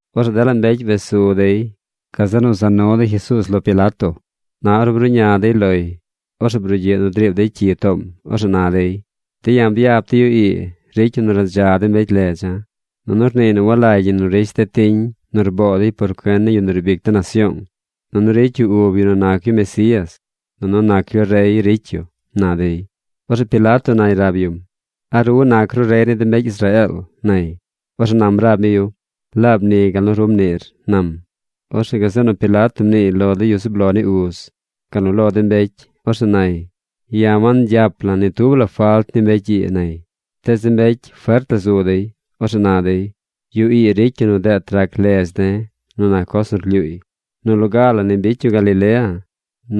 Orzeꞌ dela mbecy wes su dey. Gazeꞌ nu za nu dey Jesuuz lo Pilato. Na ornu bruꞌña dey loy, orzeꞌ brugyiꞌ nu driib dey cyi toom. Orzeꞌ na dey: ―De̱ ya̱ byap de̱ yu ii ricy yu nu radza de mbecy ledza̱. Nunu rniiy nu walagy ñi nu rish de̱ tiñ nu rboo dey por cuen ni yu nu riib ic de nasyoong. Nunu ricy yu ub yu nu nac yu Mesías. Nunu nac yu rey ricy yu ―na dey. Orzeꞌ Pilato nay rab yum: ―¿A ru nac ru rey ni de mbecy Israeel? ―nay. Orzeꞌ nam rab mi yu: ―Laab ni gal nu ru mniir ―nam. Orzeꞌ gazeꞌ nu Pilato mniiy lo de yu zub lo ni uz, gal nu lo de mbecy. Orzeꞌ nay: ―Ya̱ wangyap la̱ ni tub la falt ni mbecy ii ―nay. Tees de mbecy fert la zu dey. Orzeꞌ na dey: ―Yu ii ricy yu nu deet rac ledz de̱ nu nac coz nu rlyuuy. Nu loga la ni bicy yu Galilea.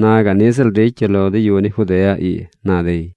Na gaꞌ niꞌ ziꞌl ricy yu lo de yu ni Judea ii ―na dey.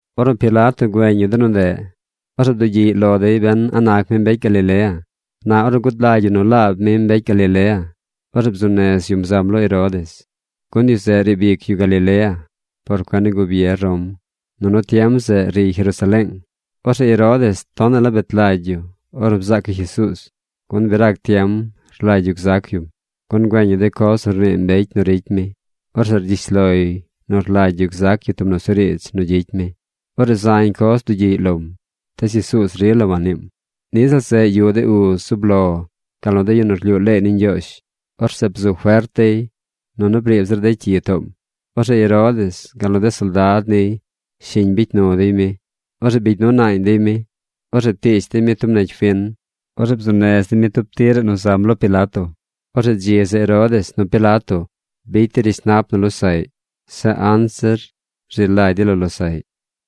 Ornu Pilato güeñ yu de nu ndeꞌ, orzeꞌ bdugyiꞌy lo dey ben a nac mi mbecy Galilea. Na ornu gud lagy yu nu laab mi mbecy Galilea, orzeꞌ bzuu nez yum zam lo Herodes, gun yu zeꞌ riib ic yu Galilea por cuen ni gubier Rom, nunu tiem zeꞌ riy Jerusaleeng. Orzeꞌ Herodes tonaꞌ la bet lagy yu ornu bzaac yu Jesuuz, gun bi rac tiem rlagy yu gzac yum, gun güeñ yu de coz nu rnii mbecy nu ricy mi. Orzeꞌ rgyish loy nu rlagy yu zac yu tub nusuriidz nu gyicy mi. Orzeꞌ zañ coz bdugyiꞌy lom. Tees Jesuuz rila wanniim. Niꞌ ziꞌl zeꞌ yuꞌ de uz zub lo gal nu de yu nu rlyuu leey ni Ñgyoozh. Orzeꞌ bzu fert dey, nunu briib zir dey cyi toom. Orzeꞌ Herodes gal nu de soldad niy shiñ bicy nu dey mi. Orzeꞌ bigy nu naañ dey mi. Orzeꞌ ptiish dey mi tub negy fin. Orzeꞌ bzuu nez dey mi tub tiraꞌ nu zam lo Pilato. Orzeꞌ dzi zeꞌ Herodes nu Pilato bicy dey rishnap nu losaꞌy. Zeꞌ anzir rzi lagy dey lo losaꞌy.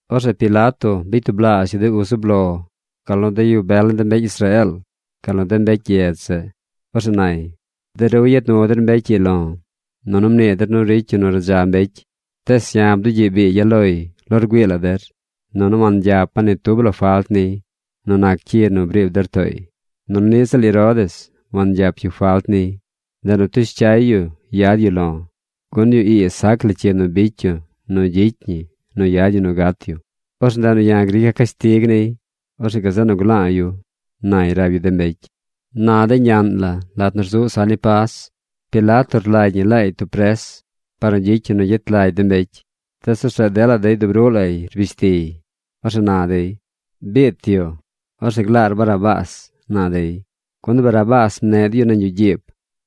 Orzeꞌ Pilato bicy tublaazh yu de uz zub lo, gal nu de yu bel ni de mbecy Israeel, gal nu de mbecy gyedz zeꞌ. Orzeꞌ nay: ―De ru yad nu der mbecy ii lo̱, nunu mnii der nu ricy yu nu radza mbecy. Tees ya̱ bdugyiꞌ biigya̱ loy lo rgüii la der, nunu wangyapa̱ ni tub la falt niy nu nac cyi nu briib der tooy. Nunu niꞌ ziꞌl Herodes wangyap yu falt niy. Ndeꞌ nu ptush cyay yu yad yu lo̱. Gun yu ii sac la cyi nu bicy yu nu gyicy ñi nu yad ñi nu gat yu. Orzeꞌ ndeꞌ nu ya̱ grica̱ cashtig niy. Orzeꞌ gazeꞌ nu gla̱a̱ yu ―nay rab yu de mbecy. Na de ñaꞌn la, lat nu rzuꞌ saꞌ ni Pas, Pilato rlagy ñi laay tub pres par nu gyicy yu nu gyet lagy de mbecy. Tees orzeꞌ dela dey dub ruꞌ lay rbish tiy. Orzeꞌ na dey: ―¡Biit yu! ¡Orzeꞌ glaar Barrabás! ―na dey. Gun Barrabás mneꞌ dey yu nañ yuꞌ gyiib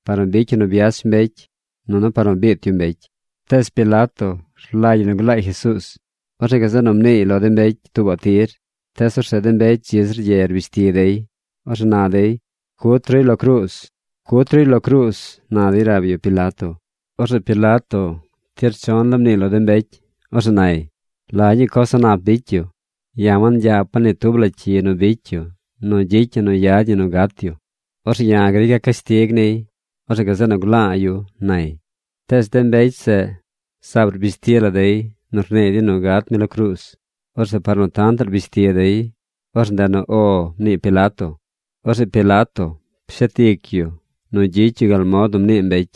par nu bicy yu nu byach mbecy, nunu par nu biit yu mbecy. Tees Pilato rlagy yu nu glaay Jesuuz. Orzeꞌ gazeꞌ nu mniiy lo de mbecy tuubaꞌ tir. Tees orzeꞌ de mbecy dzi zir ye rbish ti dey. Orzeꞌ na dey: ―¡Cut ruy lo cruuz! ¡Cut ruy lo cruuz! ―na dey rab yu Pilato. Orzeꞌ Pilato tir chon la mniiy lo de mbecy. Orzeꞌ nay: ―¿La ñuu coz a̱ꞌ nap bicy yu? Ya̱ wangyapa̱ ni tub la cyi nu bicy yu nu gyicy ñi nu yad ñi nu gat yu. Orzeꞌ ya̱ grica̱ cashtig niy. Orzeꞌ gazeꞌ nu gla̱a̱ yu ―nay. Tees de mbecy zeꞌ rzaab rbish ti la dey nu rnii dey nu gat mi lo cruuz. Orzeꞌ par nu tantaꞌ rbish ti dey, orzeꞌ ndeꞌ nu “O” mnii Pilato. Orzeꞌ Pilato pshet ic yu nu gyicy yu gal mod nu mnii dey.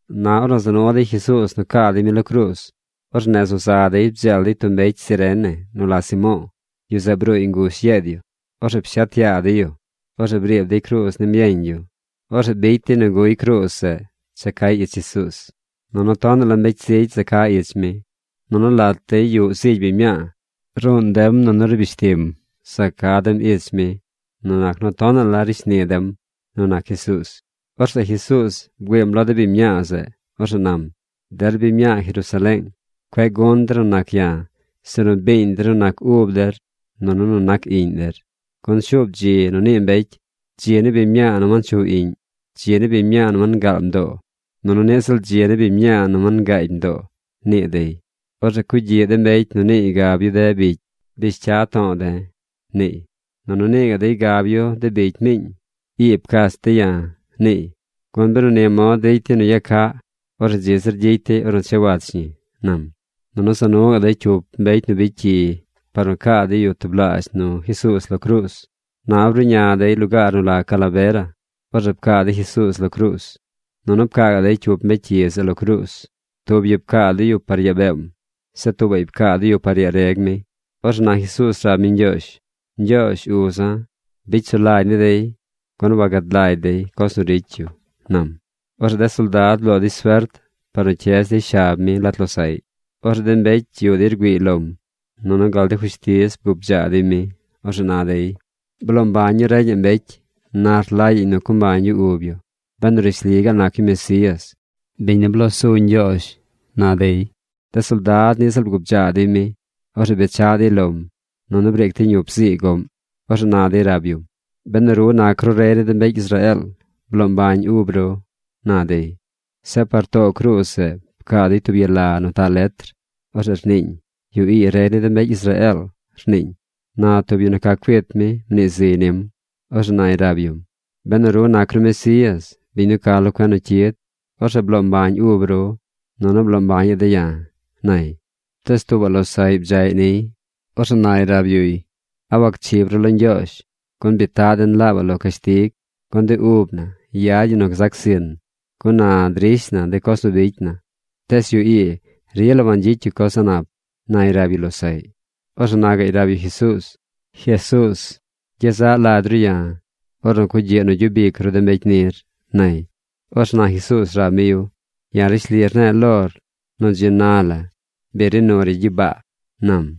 Na ornu za nu dey Jesuuz nu caa dey mi lo cruuz, orzeꞌ nez nu za dey bdzeel dey tub mbecy Cirene nu la Simo̱o̱. Yu zeꞌ bruuy ngush yeed yu. Orzeꞌ pshet yaa dey yu. Orzeꞌ briib dey cruuz nim yeñ yu. Orzeꞌ bicy dey nu guy cruuz zeꞌ cha cay ich Jesuuz. Nunu tonaꞌ la mbecy zigy za ca ich mi. Nunu lat dey yuꞌ zigy biñ mñaa. Ruun dem nunu rbish tim za ca dem ich mi nu nac nu tonaꞌ la ricy shni dem nu nac Jesuuz. Orzeꞌ Jesuuz bgüiim lo de biñ mñaa zeꞌ. Orzeꞌ nam: ―Der biñ mñaa Jerusaleeng, cueꞌ gun der nu nac ya̱, sinu biiñ der nu nac ub der nunu nu nac iꞌñ der. Gun shuub dzi nu nii mbecy: “Dzi ni biñ mñaa nu wanchuꞌ iꞌñ. Dzi ni biñ mñaa nu wangaal mdoo. Nunu niꞌ ziꞌl dzi ni biñ mñaa nu wangaagy mdoo”, nii dey. Orzeꞌ cugyiꞌ de mbecy nu niiy gab yu de bicy: “¡Bish cya to̱o̱ de̱!”, niiy, nunu nii gaꞌ dey gab yu de bicy miiñ: “¡I pcach de̱ ya̱!” niiy. Gun benu ni mod ricy dey nu yag caꞌ, orzeꞌ dzi zir gyicy dey ornu cha wach ñi ―nam. Nunu za nu gaꞌ dey cyup mbecy nu bicy cyi par nu caa dey yu tublaazh nu Jesuuz lo cruuz. Na ornu bruꞌña dey lugaar nu la Calavera, orzeꞌ pcaa dey Jesuuz lo cruuz. Nunu pcaa gaꞌ dey cyup mbecy cyi zeꞌ lo cruuz. Tub yu pcaa dey yu par yaa beem. Zeꞌ tuubaꞌy pcaa dey yu par yaa reg mi. Orzeꞌ na Jesuuz rab mi Ñgyoozh: ―Ñgyoozh uza̱, bicy sulagy ni dey, gun wagad lagy dey de coz nu ricy yu ―nam. Orzeꞌ de soldad bloo dey suert par nu cyez dey shab mi lat losaꞌy. Orzeꞌ de mbecy yuꞌ dey rgüiiy lom. Nunu gal de fushtiz bgubdzaa dey mi. Orzeꞌ na dey: ―Bloo mbañ yu reñaꞌ mbecy. Na rlagyaꞌñ nu co mbañ yu ub yu benu rishli gaal nac yu Mesías, biñ nu bloo zu Ñgyoozh ―na dey. De soldad niꞌ ziꞌl bgubdzaa dey mi. Orzeꞌ bechaꞌ dey lom nunu briic dey ñup zii goꞌm. Orzeꞌ na dey rab yum: ―¡Benu ru nac ru rey ni de mbecy Israeel, bloo mbañ ub ru! ―na dey. Zeꞌ par too cruuz zeꞌ pcaa dey tub yala nu taꞌ letr. Orzeꞌ rniiñ: “Yu ii rey ni de mbecy Israeel”, rniiñ. Na tub yu nu ca cuit mi mnii ziy nim. Orzeꞌ nay rab yum: ―Benu ru nac ru Mesías, biñ nu ca lo cuen nu cyid, orzeꞌ bloo mbañ ub ru, nunu bloo mbañaꞌ de̱ ya̱ ―nay. Tees tuubaꞌ losaꞌy bdzaꞌy niy. Orzeꞌ nay rab yuy: ―¿A wacchib ru lo Ñgyoozh? Gun bi taꞌ den laabaꞌ lo cashtig. Gun de ub na yad ñi nu gzac zin, gun na drish na de coz nu bicy na. Tees yu ii rila wangyicy yu coz a̱ꞌ nap ―nay rab yu losaꞌy. Orzeꞌ na gaꞌy rab yu Jesuuz: ―Jesuuz, gyezaꞌ lagy ru ya̱, ornu cugyiꞌ nu gyub ic ru de mbecy nir ―nay. Orzeꞌ Jesuuz nam rab mi yu: ―Ya̱ rishli rne̱e̱ lor nu dzi na bi ri nur ya gyibaa ―nam.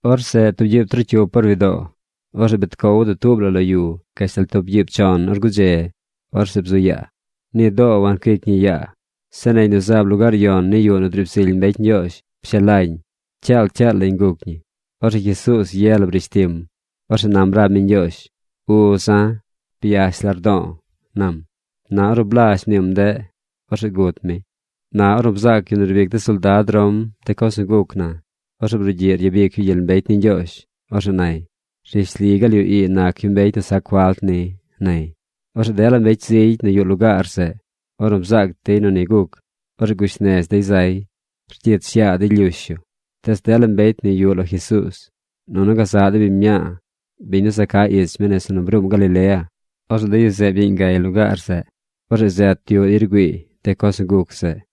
Orzeꞌ tub gyiib trocyup or widoo, orzeꞌ bet cow dutuub la lo yu gashtal gyiib chon or gudze. Orzeꞌ bzu yaa. Ni doo wancuic ñi yaa. Zeꞌ negy nu zaab lugaar yon ni yuꞌ nu driib zily mbecy Ñgyoozh pshelañ. Cyaal, cyaal lañ guc ñi. Orzeꞌ Jesuuz ye la brish tim. Orzeꞌ nam rab mi Ñgyoozh: ―¡Uza̱, byash lardo̱o̱! ―nam. Na ornu blazh mniim ndeꞌ, orzeꞌ gut mi. Na ornu bzaac yu nu riib ic de soldad Rom de coz nu guc na, orzeꞌ brugyiꞌ ryabic yu gyel mbecy ni Ñgyoozh. Orzeꞌ nay: ―Rishli gaal yu ii nac yu mbecy nu sac falt ni ―nay. Orzeꞌ dela mbecy zigy nu yuꞌ lugaar zeꞌ, ornu bzaac dey nu ni guc, orzeꞌ gush nez dey zay. Rgyich yaa dey lyush yu. Tees dela mbecy nu yuꞌ lo Jesuuz, nunu gazaꞌ de biñ mñaa, biñ nu za ca ich mi nese nu bruum Galilea, orzeꞌ de yu zeꞌ byeeñ gay lugaar zeꞌ. Orzeꞌ zet yuꞌ dey rgüiiy de coz nu guc zeꞌ.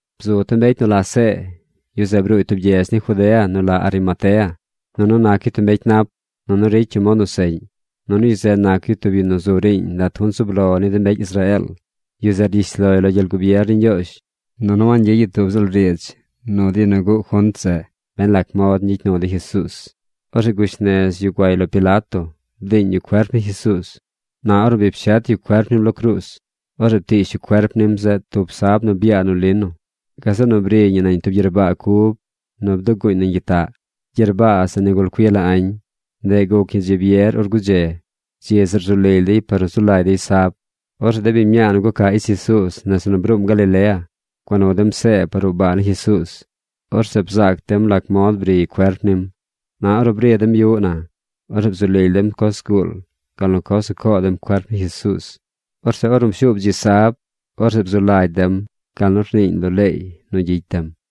Bzu tub mbecy nu la See. Yu zeꞌ bruuy tub gyedz ni Judea nu la Arimatea. Nunu nac yu tub mbecy nap. Nunu ricy yu mod nu seꞌñ. Nunu yu zeꞌ nac yu tub yu nu zu riiñ lat de junt zub lo ni de mbecy Israeel. Yu zeꞌ rgyish loy lo gyel gubier ni Ñgyoozh, nunu wangyicy yu tub ziꞌl riidz nu de yu nu guꞌ junt zeꞌ ben lac mod ñgyicy nu dey Jesuuz. Orzeꞌ gush nez yu guay lo Pilato bdiiñ yu cuerp ni Jesuuz. Na ornu bi pshet yu cuerp nim lo cruuz, orzeꞌ ptiish yu cuerp nim zeꞌ tub sab nu byaa nu lino. Gazeꞌ nu briy ñi nañ tub gyerbaa cub nu bduguuñ nañ tub gyitaꞌ. Gyerbaa zeꞌ nigul cui la añ. Ndeꞌ guc ñi dzi byer or gudze. Dzi zeꞌ rzu lily dey par nu zu lagy dey sab. Orzeꞌ de biñ mñaa nu guca ich Jesuuz nese nu bruum Galilea gua nu dem See par ruꞌ baa ni Jesuuz. Orzeꞌ bzaac dem lac mod briy cuerp nim. Na ornu bri dem yuꞌ na, orzeꞌ bzu lily dem coz zguul gal nu coz nu coo dem cuerp ni Jesuuz. Orzeꞌ ornu pshuub dzi sab, orzeꞌ bzu lagy dem gal nu rniiñ lo leey nu gyicy dem.